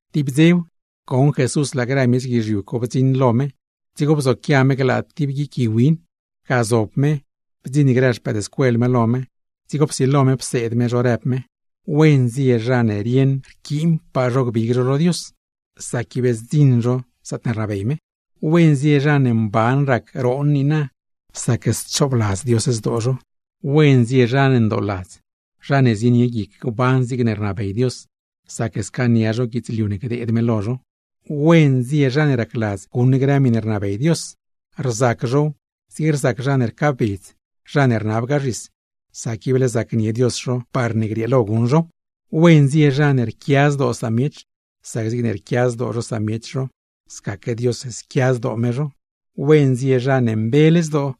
Tib dzew, goṉ Jesús laa grë miech guizhiu co bdziṉ lo me, dzigo bzoquia me glaa tib guic gui win. Ga zob me, bdziṉ grë xpëëdscuel me lo me, dzigo psilo me pseed me zho, rëb me: ―¡Wen zie zha ne rieṉ ib none gbig zho lo Dios, sac ib zdziṉ zho zaatne rnabey me! ’¡Wen zie zha ne mban rac roon niina, sac schoobladz Dios zdoo zho! ’¡Wen zie zha ndooladz, zha ne zienie guic gban zigne rnabey Dios, sac scaania zho guidzliu ne gdeed me lo zho! ’¡Wen zie zha ne racladz guṉ grë miṉe rnabey Dios, rzac zhow zigne rzac zha ne rcaabedz, zha ne rnabgaa zhis, sac ible zacnie Dios zho parne grieelo guṉ zhow! ’¡Wen zie zha ne rquia zdoo miech, sac zigne rquia zdoo zho samiech zho scaque Dios squia zdoo me zho! ’¡Wen zie zha ne mbele zdoo,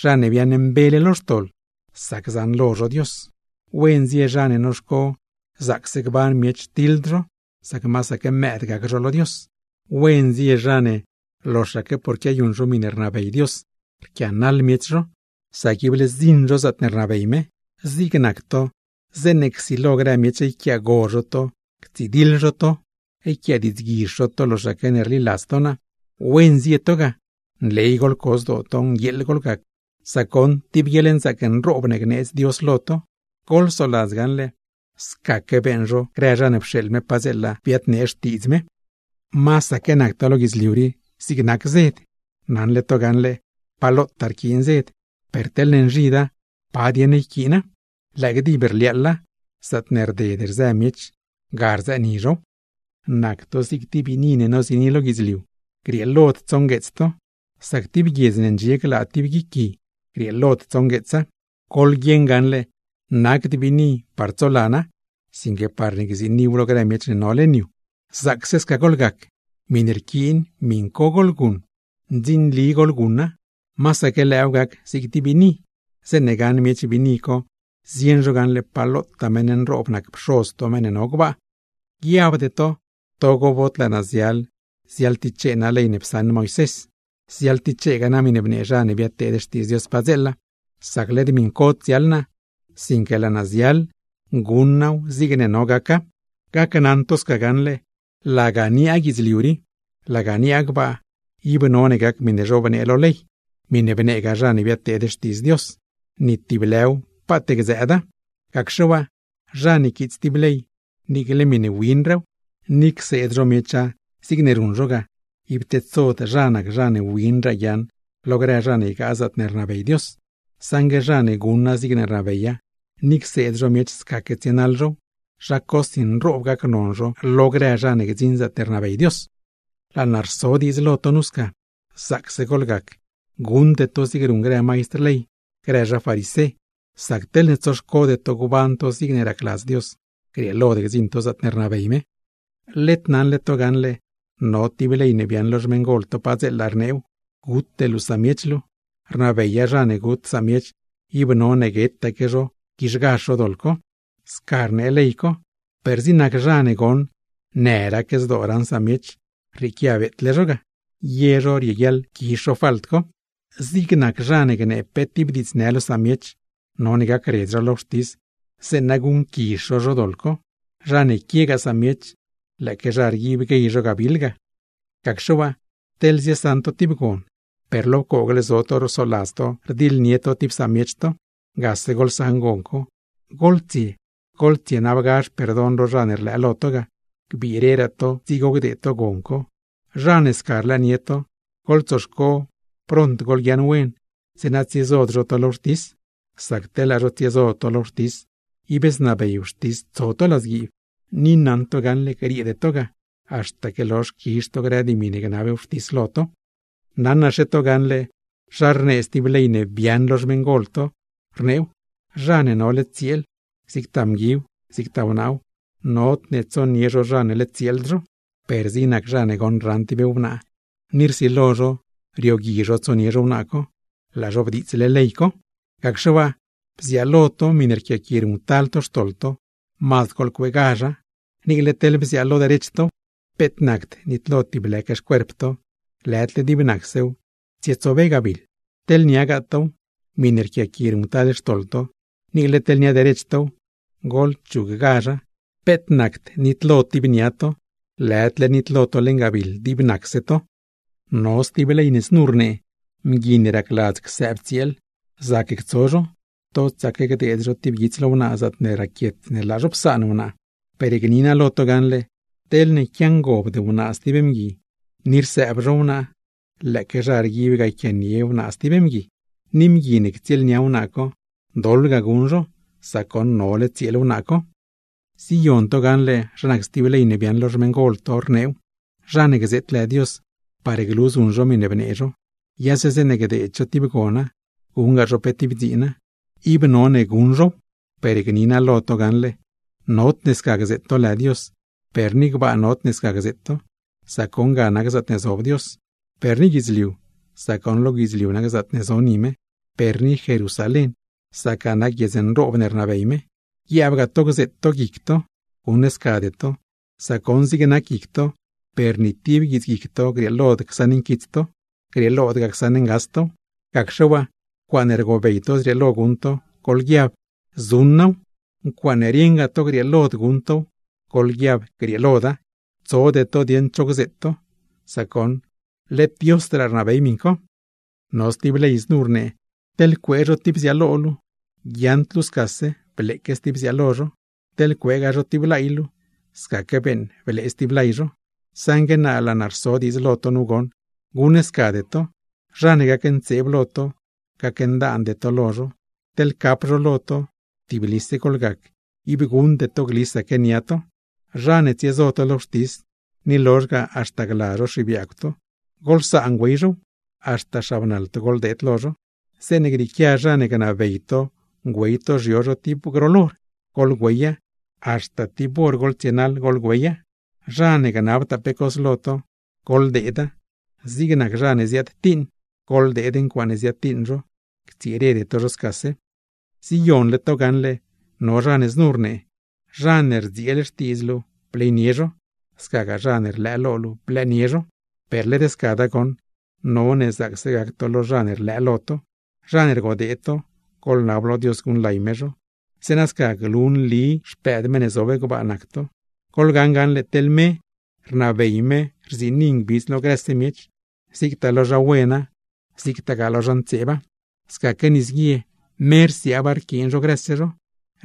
zha ne biaaṉmbele lo xtoḻ, sac zaṉlo zho Dios! ’¡Wen zie zha ne noxco zaacse gban miech, tiḻd zho, sac masaque mëëd gac zho lo Dios! ’¡Wen zie zha ne loxaque porne quiayuṉ zho miṉe rnabey Dios, rquianaḻ miech zho, sac ible zdziṉ zho zaatne rnabey me! ’Zig nac to, zeeṉe csilo grë miech yquiaago zho to, ctsidiḻ zho to, yquiadiidzguizh zho to loxaque ne rliladz to naa, ¡wen zie to ga! ¡Nley goḻco zdoo to, nguieeḻ goḻgac, sac goṉ tib guieḻnzaac nroob ne gneedz Dios lo to! Goḻsoladz gaṉle, scaque beeṉ zho grë zha ne pxeeḻ me padzeela biadnee xtiidz me. ’Masaque nac to lo guidzliu rii zig nac zed. Naṉle to gaṉle pa lotaa rquiin zed, per teḻne nzhida, ¿pa dieṉ rquiina? ¡Lëë gdib rliaaḻa lo guizh, zaatne rded rzë miech rzëëni zhow! ’Nac to zig tib biini ne noziini lo guidzliu. Grieelod tsongueets to, sac tib guiedz ne ndxie glaa tib guic gui, grieelod tsongueetsa. Goḻguieṉ gaṉle nacd biini parne tsolana, sinque parne gziiniw lo grë miech ne no leṉ yu. Zaacse sca goḻgac, miṉe rquiin miṉ co goḻguṉ, masaque lëëw gac zig tib biini; zeeṉa zeeṉe gaṉ miech biini co zieṉ zho gaṉle pa lotaa meṉ nroob nac Pxoz to meṉ ne no gbaa. ’Guiabde to togo bod laa naa ziaḻ ziaḻtichee naa ley ne psaṉ Moisés, o grëgaa miṉe bnee zha ne biadteed xtiidz Dios padzeela; sac led miṉcod ziaḻ naa, sinque laa naa ziaḻ guṉ naaw zigne no gaca. Gneli naa lo to gaṉle: Laga niaa guidzliu rii, laga niaa gbaa, ib none gac miṉe zhobnee lo ley, miṉe bneegaa zha ne biadteed xtiidz Dios, ni tib lë paat gdzëëda. Gacxe waa zha ne quiits tib ley niicle miṉe mazdraa wina, ni cseed zho miecha zigne ruṉ zho ga, ib tedsod zha nac zha ne mazdraa win guiaaṉ lo grë zha ne ygaa zaatne rnabey Dios. Saṉgue zha ne guṉa zigne rnabeya, ni cseed zho miech scaque tsienaḻ zhow, zha cosi nroob gacnon zho lo grë zha ne gdziṉ zaatne rnabey Dios. ’Rso naa diidz lo to sca, zaacse goḻgac guṉde to zigne ruṉ grë maistr ley, grë zha farisé; sac teḻne tsoxcode to gban to zigne racladz Dios, grieelod gdziṉ to zaatne rnabey me. ’Led naṉle to gaṉle, no tib ley ne biaaṉ lo xmeṉgol to padzeela, rneew: “Gute luu samiech luu”; rnabeya zha ne gut samiech, ib none guetaque zho, quizhgazh zho doḻ co. Sca rnee ley co, per zig nac zha ne goṉ në rac zdoo raṉ samiech, rrieequia beetle zho ga, ye zho rieguiaḻ quizh falt co. Zig nac zha ne gnee pe tib diidznë lo samiech, none gacredz zho lo wxtis zeeṉa guṉquizh zho zho doḻ co; zha ne quiegaa samiech, lëëque zha rguib guey zho gabiḻ ga. ’Gacxe waa teḻ ziesaṉ to tib gon, per lo pcoogle zo to rsoladz to rdiḻnie to tib samiech to, gase goḻsaṉ gon co, goḻtsie goḻtsienabgazh perdon lo zha ne rlëë to lo ga, gbireraa to dzigo gdeed to gon co. Zha ne sca rlëënie to, goḻtsoxco pront goḻguiaaṉ wen; zeeṉa tsiezod zho to lo wxtis, sac teḻ laa zho tsiezo to lo wxtis ib znabey wxtis tso to ladzguiib. Gneli naa lo to gaṉle grieede to ga, haxtaque lozh quizh to grë dimi ne gnab wxtis lo to. ’Naṉlaque to gaṉle zha rnee stib ley ne biaaṉ lo xmeṉgol to, rneew: “Zha ne nole tsieel, zigtaa mguiw zigtaa wnaaw, nodne tsonie zho zha ne led tsieeld zho.” Per zig nac zha ne goṉ, raṉ tib wnaa ni rsilo zho riogui zho tsonie zho wnaa co, laa zho bdiitsle ley co. ’Gacxe waa, bziaalo to miṉe rquiaqui ruṉctal to xtoḻ to, mazd goḻcueegazha; niicle teḻ bziaalo derech tow. Peet nacd nitlo tib lëque xcuerp to, lëdle dib nacsew tsietsobe gabiḻ. Laa teḻ niagaa tow, miṉe rquiaqui ruṉctal to xtoḻ to, niicle teḻ nia derech tow, goḻchuggazha. Peet nacd nitlo tib nia to, lëdle nitlo to leṉ gabiḻ dib nacse xcuerp to. ’No stib ley znu rnee: “Mgui ne racladz csaan tsieel, zac ctso zho; totsaque gdeed zho tib guits lo wnaa, zaatne raquiet ne laa zho psaan wnaa.” Per gni naa lo to gaṉle: teḻne quiangobd tsieel zho stib mgui, ni rsëbtsieel zho, lëëque zha rguib ga yquianie tsieel zho stib mgui. Mgui ne ctsieelnia wnaa co, doḻ ga guṉ zho, sac goṉ nole tsieel wnaa co. ’Ziyon to gaṉle zha nac stib ley ne biaaṉ lo xmeṉgol to rneew: “Zha ne gzeet lë Dios par glu zuṉ zho miṉe bnee zho, yase zeeṉe gdeed zho tib gona, guṉgaa zho pe tib dziina, ib none guṉ zhow.” Per gni naa lo to gaṉle: nodne sca gzeet to lë Dios, per ni gbaa nodne ne sca gzeet to, sac goṉ ga nac zaatne zob Dios; per ni guidzliu, sac lo guidzliu nac zaatne zo ni me; per ni Jerusalén, sac ga nac guiedz nroob ne rnabey me; guiaabgaa to gzeet to guic to. Guṉscade to, sac goṉ zig nac guic to, per ni tib guitsguic to grieelod csaṉ nquits to, grieelodgaa csaṉ ngas tow. Gacxe waa ncuaaṉe rgobey to zrieelo guṉ to, goḻguiab: “zuṉ naaw”, togo rieṉgaa to grieeloda, goḻguiab: “grieeloda”; tsode to dieeṉ cho gzeet to, sac goṉ led Diosdraa rnabey miṉ co. ’No stib ley znu rnee: “Teḻ cuee zho tib bziaalo luu, guiaaṉd luu scase bleeque stib bziaalo zho, teḻ cueegaa zho tib lay luu, scaque beeṉ blee stib lay zho.” Saṉgue naa laa naa rso diidz lo to goṉ, guṉscade to; zha ne gacntseeb lo to, gacndaande to lo zho. Teḻ cap zho lo to, tiblise goḻgac, ib guṉde to glisaque nia to. ’Zha ne tsiezo to lo wxtis, ni lozh ga haxta gla zho xibiaagw to, goḻsaan güey zhow haxta xabnaḻ to goḻdeed lo zho. Zeeṉe grieequia zha ne gnabey to güey to xyo zho tib groḻ hor, goḻgüeya, haxta tib hor goḻtsie güey tow. Zha ne gnabtaa pe cos lo to, goḻdeeda; zig nac zha ne ziadtiiṉ, goḻdeed ncuaaṉe ziadtiiṉ zho, ctsirede to zho scase. ’Ziyonle to gaṉle no zha ne znu rnee: “Zha ne rdzieel xtiidz luu bleynie zho, scagaa zha ne rlëë lo luu, blëënie zho.” Per led scada goṉ, ¡none zaacse gac to lo zha ne rlëë lo to! ¡Zha ne rgodee to, goḻnab lo Dios guṉlay me zho! Zeeṉa sca glu nli xpëëd meṉ ne zob gbaa nac to. Goḻgaṉ gaṉle teḻ me rnabey me rziini ngbidz lo grëse miech, zigtaa lo zha wena, zigtagaa lo zha ntseeba; scaque nisguie me rsiaaba rquiin zho grëse zho,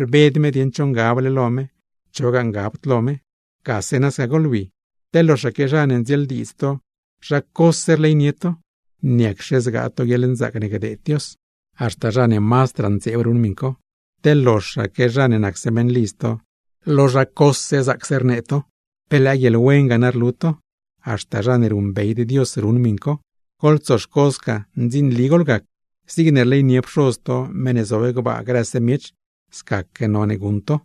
rbed me dieṉ cho ngable lo me, chogaa ngabd lo me. ¡Gase nasca goḻwi! Teḻ loxaque zha ne ndzieeldiidz to zha cose rleynie to, ¿niacxe zgaa to guieḻnzaac ne gdeed Dios? Haxta zha ne mazdraa ntseeb ruṉ miṉ co. Teḻ loxaque zha ne nacse meṉlidz to, lo zha cose zaacse rnee to, ¿pe lëë guieḻwen ga na rlu to? Haxta zha ne ruṉbeyd Dios ruṉ miṉ co. Goḻtsoxco sca ndzinli goḻgac, zigne rleynie Pxoz to (meṉ ne zob gbaa) grëse miech, scaque none guṉ to.